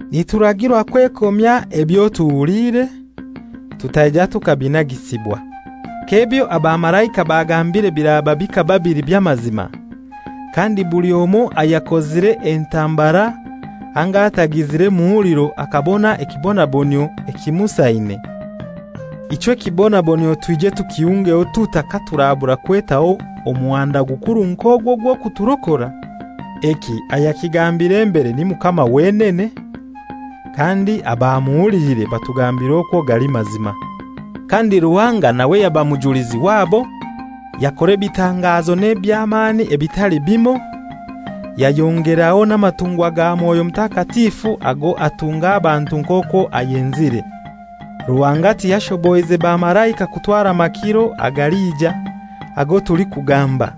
Nituragirwa kwekomya ebyo tuhuliire, tutaija tukabinagisibwa. K'ebyo abamalaika bagambire biraba bikaba bili by'amazima, kandi buli omoi ayakozire entambara anga atagizire muhuliro akabona ekibonabonyio ekimusaine, ichwe ekibonabonyio twije tukihungeho tutai katuurabura kwetaho omuhanda gukuru nk'ogu ogw'okuturokora? Eki ayakigambire mbere ni Mukama wenene, kandi abamuhuliire batugambira okwo gali mazima. Kandi Ruhanga nawe yaba mujulizi wabo, yakora ebitangazo n'eby'amani ebitali bimoi, yayongeraho n'amatungwa ga Mwoyo Mutakatifu ago atunga abantu nk'okwo ayenzire. Ruhanga tiyashoboize bamalaika kutwara makiro agalija, ago tulikugamba.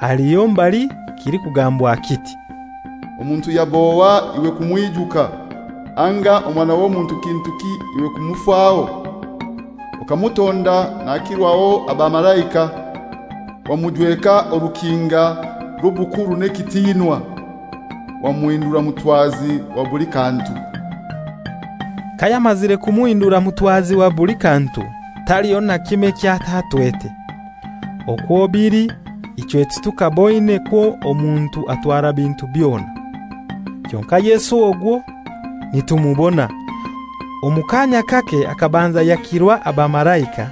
Haliho mbali kilikugambwa kiti, «Omuntu yab'ohai iwe kumwijuka, anga omwana w'omuntu kintuki iwe kumufaho? Okamutonda nakirwaho abamalaika, wamujweka orukinga rw'obukuru n'ekitiinwa. Wamuhindura mutwazi wa buli kantu.» Kayamazire kumuhindura mutwazi wa buli kantu, taliho na kimoi eky'atatwete. Okwo bili ichwe titukaboine kwo omuntu atwara bintu byona. Kyonkai Yesu ogwo nitumubona. Omu kaanya kake akabanza yakirwa abamalaika,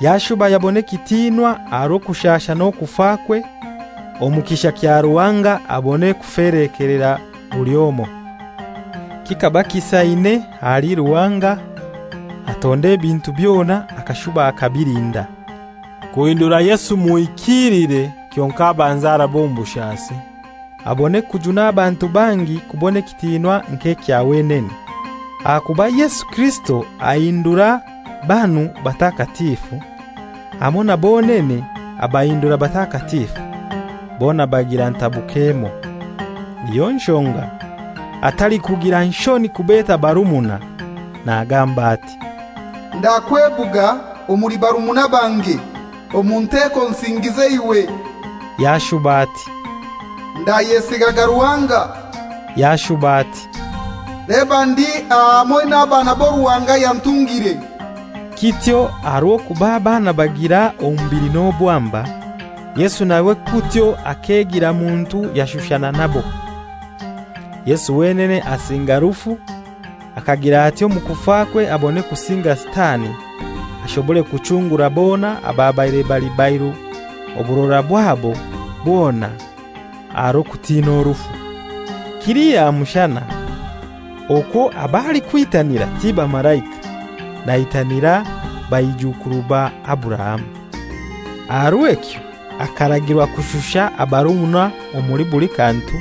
yashuba yabona ekitiinwa aha rw'okushasha n'okufakwe, omu kisha kya Ruhanga abone kufelekelera buli omoi. Kikaba kisaine ahali Ruhanga, atonda ebintu byona akashuba akabilinda, kuhindura Yesu muhikiilire kyonkai abanze arabe omu bushasi, abone kujuna abantu bangi kubona ekitiinwa nk'ekya wenene. Ahakuba Yesu Kirisito ahindura banu batakatifu, hamoi na bonene abahindura batakatifu, bona bagira ntabuko emoi. Niyo nshonga atalikugira nshoni kubeta barumuna, nagamba ati, «Ndakwebuga omuli barumuna bange, omu nteko nsingiize iwe.» Yashuba ati, «Ndayesigaga Ruhanga.» Yashuba ati, «Leba ndi aha hamoi n'abaana abo Ruhanga yantungire.» Kityo aha rw'okuba abaana bagira omubili n'obwamba, Yesu nawe kutyo akegira muntu yashushana nabo. Yesu wenene asinga rufu akagira atyo omu kufakwe abone kusinga Sitani, ashobore kuchungura bona ababaire bali bairu oburora bwabo bwona aha rw'okutina rufu. Kili aha mushana okwo ab'alikwitanira ti bamalaika, naitanira baijuukuru ba Aburahamu. Aha rw'ekyo akaragirwa kushusha abarumuna omuli buli kantu,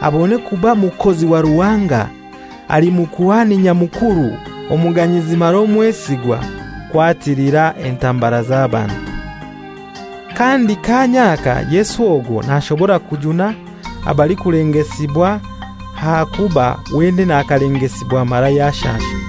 abone kuba mukozi wa Ruhanga ali Mukuhani Nyamukuru omuganyizi mara omwesigwa, kwatilira entambara z'abantu. Kandi kaanya aka Yesu ogwo nashobora kujuna abalikulengesibwa ahakuba wenene akalengesibwa mara yashasha.